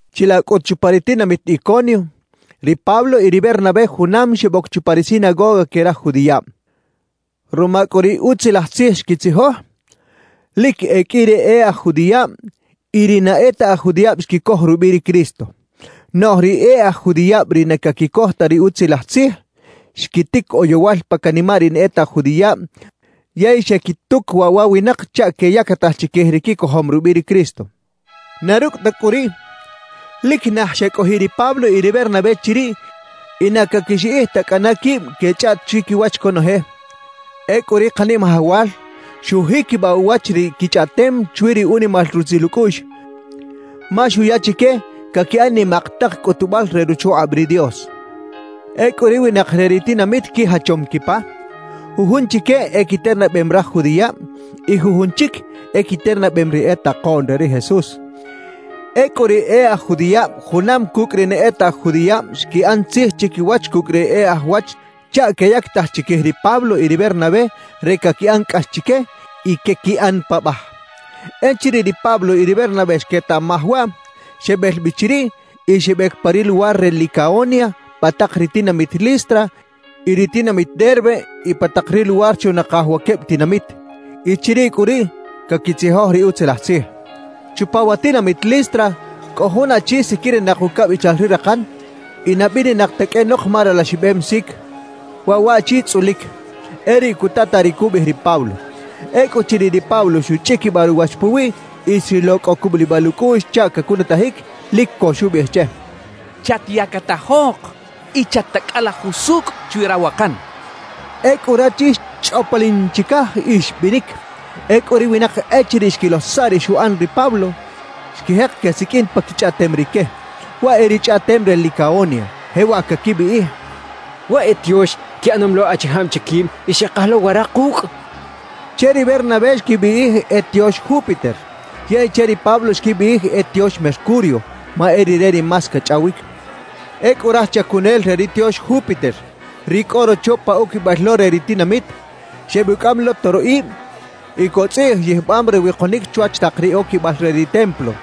Chilaꞌ cꞌut chupa ri tinamit Iconio, ri Pablo y ri Bernabé junam xeboc chupa ri sinagoga que raj judiꞌab. Ruma cꞌu ri Utzilaj Tzij xquitzijoj, lic e qꞌui ri e aj judiꞌab y ri na e ta aj judiꞌab xquicoj rubiꞌ ri Cristo. Noꞌj ri e aj judiꞌab ri na caquicoj ta ri Utzilaj Tzij, xquitic oyowal pa canimaꞌ ri na e ta aj judiꞌab yey xequituc waꞌ wa winak chaꞌ queyactaj chiquij ri quicojom rubiꞌ ri Cristo. Na rucꞌ ta cꞌu riꞌ, lic naj xecꞌojiꞌ ri Pablo y ri Bernabé chiriꞌ y na caquixiꞌij ta cꞌana quib quechꞌaꞌt chiquiwach conoje. Ecꞌu ri Kanimajawal xujiquibaꞌ uwach ri quichꞌaꞌtem chwi ri unimal rutzil ucꞌuꞌx, ma xuya chique caquiꞌan nimak tak cꞌutubal re ruchukꞌab ri Dios. Ecꞌu ri winak re ri tinamit quijachom quipa; jujun chique equiternabem raj judiꞌab y jujun chic equiternabem ri e takoꞌn re ri Jesús. Ecꞌu ri e aj judiꞌab junam cucꞌ ri na e ta aj judiꞌab xquiꞌan tzij chiquiwach cucꞌ ri e aj wach chaꞌ queyactaj chiquij ri Pablo y ri Bernabé re caquiꞌan cꞌax chique y quequiꞌan paꞌbaj. Echiriꞌ ri Pablo y ri Bernabé xquetaꞌmaj waꞌ, xebel bi chiriꞌ y xebec pa ri luwar re Licaonia pa tak ri tinamit Listra y ri tinamit Derbe y pa tak ri luwar chunakaj wa queb tinamit. Y chiriꞌ cꞌu riꞌ caquitzijoj ri Utzilaj Tzij. Chupa wa tinamit Listra cꞌo jun achi siquirinak ucabichal ri rakan y na bininak ta qꞌuenok ma ralaxibem sic. Waꞌ waꞌchi tzꞌulic, e riꞌ cutataꞌ ri cubiꞌij ri Pablo. Ecꞌuchiriꞌ ri Pablo xuchꞌiquibaꞌ ruwach puwiꞌ y xrilo cꞌo cubulibal ucꞌuꞌx chaꞌ cacunutajic, lic co xubiꞌij che: —¡Chatyactajok y chat-tacꞌala jusucꞌ chwi rawakan! —xchaꞌ. Ecꞌu rachi xchꞌoplin chicaj y xbinic. Ecꞌu ri winak echiriꞌ xquilo saꞌ ri xuꞌan ri Pablo, xquijek quesiqꞌuin pa quichꞌaꞌtem rique, waꞌ e ri chꞌaꞌtem re Licaonia. Jewaꞌ caquibiꞌij: «¡Waꞌ e tiox quiꞌanom lo achijab che quib y xekaj lo wara kucꞌ!» quechaꞌ. Che ri Bernabé xquibiꞌij e tiox Júpiter, yey che ri Pablo xquibiꞌij e tiox Mercurio ma e rire ri más cachꞌawic. Ecꞌu raj chacunel re ri tiox Júpiter, ri cꞌo rocho pa oquibal lo re ri tinamit, xebucꞌam lo toroꞌib y cotzꞌiꞌj yijbam re wikonic chwach tak ri oquibal re ri templo.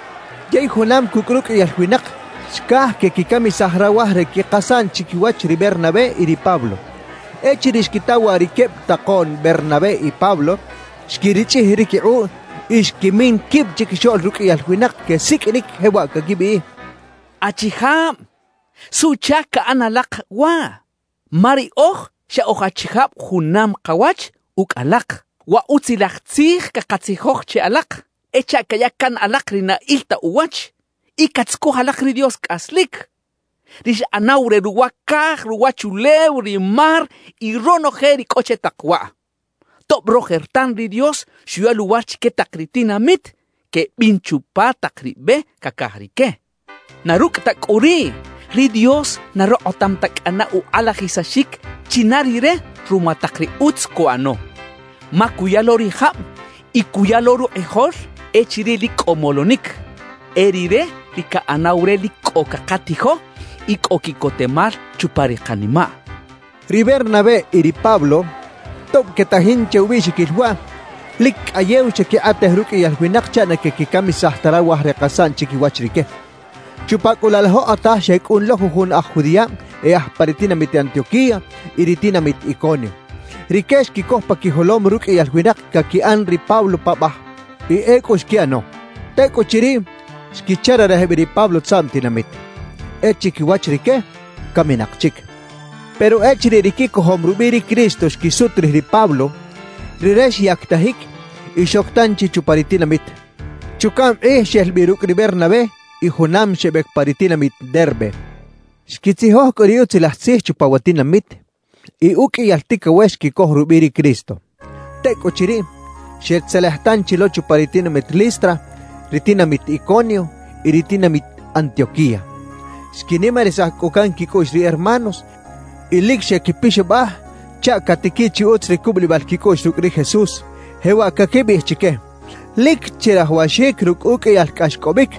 Yey junam cucꞌ ruqꞌuiyal winak xcaj quequicamisaj rawaj re quikasaꞌn chiquiwach ri Bernabé y ri Pablo. Echiriꞌ xquita waꞌ ri queb takoꞌn Bernabé y Pablo, xquirichꞌij ri quikꞌuꞌ y xquimin quib chiquixoꞌl ruqꞌuiyal winak; quesiqꞌuinic jewaꞌ caquibiꞌij: «¡Achijab!, ¿suꞌchac caꞌan alak waꞌ? Ma riꞌoj xa oj achijab junam kawach ucꞌ alak. Wa Utzilaj Tzij cakatzijoj che alak e chaꞌ caya can alak ri na il ta uwach y catzucuj alak ri Dios cꞌaslic, ri xꞌanaw re ruwa caj, ruwachulew, ri mar y ronoje ri cꞌo che tak waꞌ. Tob rojertan ri Dios xuya luwar chique tak ri tinamit quebin chupa tak ri be cacaj rique, na rucꞌ ta cꞌu riꞌ, ri Dios na rokꞌotam ta cꞌana ukꞌalajisaxic china Rire ruma tak ri utz cuꞌano. Ma cuya lo ri jab y cuya lo rukꞌijol echiriꞌ lic cꞌo molonic. E Rire ri caꞌanaw re lic cꞌo cakatijo y cꞌo quiꞌcotemal chupa ri kanimaꞌ» quechaꞌ. Ri Bernabé y ri Pablo, tob quetajin che ubiꞌxiquil waꞌ, lic cꞌayew xequikꞌatej ruqꞌuiyal winak chaꞌ na quequicamisaj ta rawaj re kasaꞌn chiquiwach rique. Chupa cꞌu laꞌ laꞌ jokꞌotaj xecꞌun lo jujun aj judiꞌab e aj pa ri tinamit Antioquía y ri tinamit Iconio. Rique xquicoj pa quijolom ruqꞌuiyal winak caquiꞌan ri Pablo paꞌbaj. Y ecꞌu xquiꞌano. Tecꞌuchiriꞌ, xquichararej bi ri Pablo tzaꞌm tinamit. E chiquiwach rique, caminak chic. Pero echiriꞌ ri quicojom rubiꞌ ri Cristo xquisut rij ri Pablo, rire xyactajic y xoc tanchi chupa ri tinamit. Chucaꞌm kꞌij xel bi rucꞌ ri Bernabé y junam xebec pa ri tinamit Derbe. Xquitzijoj cꞌu ri Utzilaj Tzij chupa wa tinamit y uqꞌuiyal ticawex xquicoj rubiꞌ ri Cristo. Tecꞌuchiriꞌ, xetzelej tanchi lo chupa ri tinamit Listra, ri tinamit Iconio y ri tinamit Antioquía. Xquinimarisaj cꞌu can quicꞌuꞌx ri hermanos y lic xequipixabaj chaꞌ catiquiꞌ chi utz ri cubulibal quicꞌuꞌx rucꞌ ri Jesús, jewaꞌ caquibiꞌij chique: «Lic chirajawaxic rucꞌ uqꞌuiyal cꞌaxcꞌobic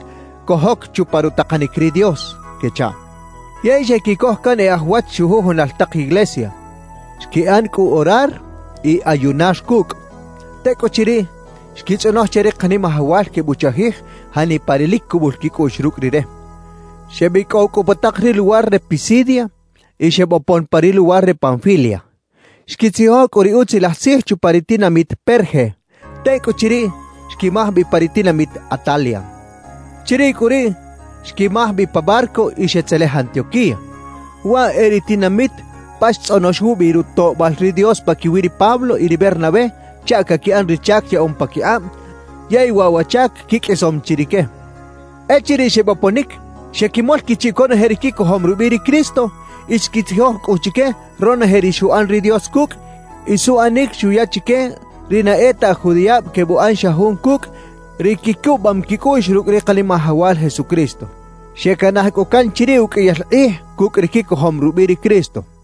cojoc chupa rutakanic ri Dios» quechaꞌ. Yey xequicoj can e aj wach chujujunal tak iglesia. Xquiꞌan cꞌu orar y ayunar cucꞌ. Tecꞌuchiriꞌ, xquitzꞌonoj che ri Kanimajawal quebuchajij janipa ri lic cubul quicꞌuꞌx rucꞌ Rire. Xebicꞌow cꞌu pa tak ri luwar re Pisidia y xebopon pa ri luwar re Panfilia. Xquitzijoj cꞌu ri Utzilaj Tzij chupa ri tinamit Perge. Tecꞌuchiriꞌ, xquimaj bi pa ri tinamit Atalia. Chiriꞌ cꞌu riꞌ xquimaj bi pa barco y xetzelej Antioquía. Waꞌ e ri tinamit pa xtzꞌonox wubi rutoꞌbal ri Dios paquiwi ri Pablo y ri Bernabé chaꞌ caquiꞌan ri chac yaꞌom paquikꞌab, yey waꞌ wa chac quiqꞌuisom chi rique. Echiriꞌ xeboponic, xequimol quichiꞌ conoje ri quicojom rubiꞌ ri Cristo y xquitzijoj cꞌu chique ronoje ri xuꞌan ri Dios cucꞌ y suꞌanic xuya chique ri na e ta aj judiꞌab quebuꞌan xa jun cucꞌ ri quicubam quicꞌuꞌx rucꞌ ri Kanimajawal Jesucristo. Xecanaj cꞌu can chiriꞌ uqꞌuiyal kꞌij cucꞌ ri quicojom rubiꞌ ri Cristo.